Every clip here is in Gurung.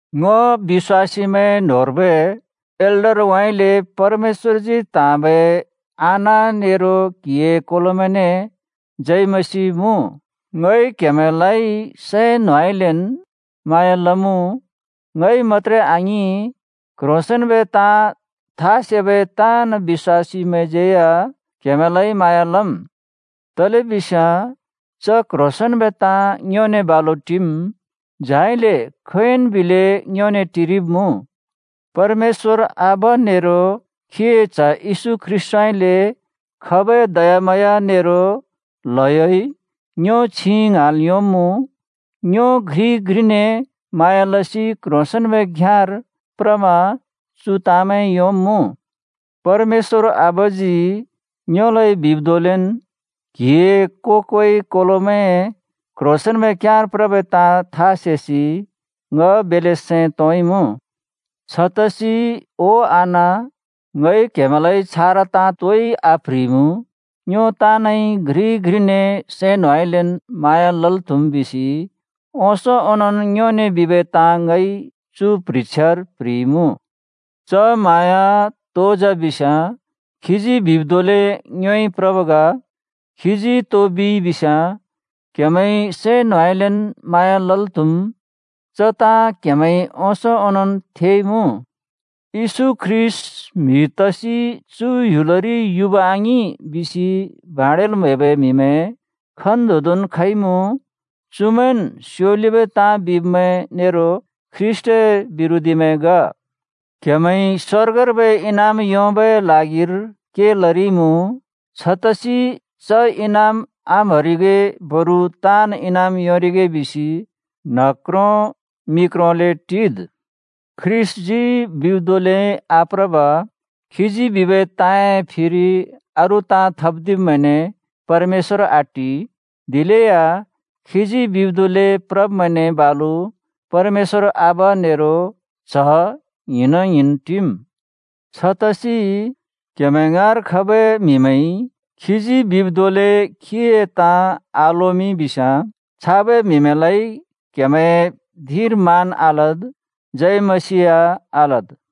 ङ बिश्‍वासीमैं न्होंर्बै एल्डरउँइँले परमेश्‍वरजी त्‍हाँबै आना नेरो क्‍हिए कोलोमैंने जय मसीह मुँ। ङइ क्‍हेमैंलाइ सैं न्होंउँइँलेन् म्हाँया लमुँ। ङइ मत्‍त्रे आङिं, क्ह्रोंसेंन्‍बै ताँ था सेबै ताँन् बिश्‍वासीमैंज्यै या क्‍हेमैंलाइ म्हाँया लम्, तलेबिस्याँ च क्ह्रोंसेंन्‍बै ताँ ङ्योने बालु टिम्, झाइले खोंयोंन् बिलै ङ्योने टिरिब्मुँ। परमेश्‍वर आबा नेरो खीए च्‍ह येशू ख्रीष्‍टउँइँले खबै दयाम्हाँया नेरो ल्हयोइ ङ्यो छिं ङ्हाँल् योंब्मुँ, ङ्यो घ्रिइ घ्रिने म्हाँया लसि क्ह्रोंसेंन्‍बै घ्‍याँर प्रमा चु ताँमैं योंब्मुँ। परमेश्‍वर आबाजी ङ्योलाइ बिब् धोंलेन् क्हिए को-कोइ कोलोमैं क्ह्रोंसेंन्‍बै घ्‍याँर प्रबै ताँ था सेसि ङ बेल्‍ले सैं तोंइमुँ। छतसि ओ आना, ङइ क्हेमैंलाइ छारा ताँ तोइ आप्ह्रिइमुँ, ङ्यो ताँनइ घ्रिइ घ्रिने सैं न्होंउँइँलेन् म्हाँया लल् त्हुम् बिसि ओंसों ओंनोंन् ङ्योने बिबै ताँ ङइ चु प्ह्रिछ्यार प्ह्रिइमुँ। च म्हाँया तो जा बिस्याँ खीजी बिब् धोंले ङ्योइ प्रब् ग। खीजी तो बिइ बिस्याँ क्हेमैंइ सैं न्होंउँइँलेन् म्हाँया लल् त्हम्। च ताँ क्‍हेमैंइ ओंसों ओनोंन् थेइमुँ। “येशू ख्रीष्‍ट म्हि तसि चु ह्‍युलरि युब आङिं” बिसि भाँड्याल् म्हैबै म्हिमैं खन्तोंदोंन् खइमुँ। चुमैंन् स्‍योलिबै ताँ बिब्‍मैं नेरो ख्रीष्‍टए बिरोधीमैं ग। क्हेमैंइ स्वर्गर्बै इनाम योंबै ल्हागिर के लरिइमुँ। छतसि च इनाम आम्हरिगे, बरु ताँन् इनाम योंरिगे बिसि न्ह क्रों मि क्रोंले टिद्। ख्रीष्‍टजी बिब् धोंले आप्रब, खीजी बिबै ताँए फिरि अरू ताँ थप्‍दिब्‍मैंने परमेश्‍वर आटि। दिलेया खीजी बिब् धोंले प्रब्मैंने बालु परमेश्‍वर आबा नेरो च्‍ह ङ्हिंना ङ्हिंन् टिम्। छतसि क्‍हेमैं ङाँर खबै म्हिमैंइ खीजी बिब् धोंले खीए ताँ आलोमिं बिस्याँ, छाबै म्हिमैंलाइ क्‍हेमैंए धिंर मान आलद्, जय मसीह या आलद्।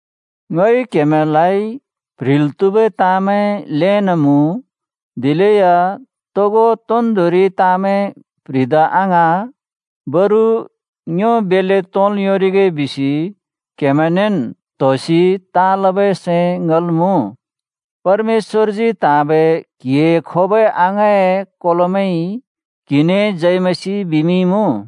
ङइ क्‍हेमैंलाइ प्ह्रिल् त्‍हुबै ताँमैं ल्‍हेन् मुँ, दिलेया तोगो तोन्दोंरि ताँमैं प्‍ह्रिदा आङ्हाँ। बरु ङ्यो बेल्‍ले तोंल् योंरिगे बिसि क्हेमैंनेन् त्होसि ताँ लबै सैं ङल् मुँ। परमेश्‍वरजी त्हाँबै क्‍हिए खोबै अङाँए कोलोमैंइ क्हिने जय मसीह बिमिंइमुँ।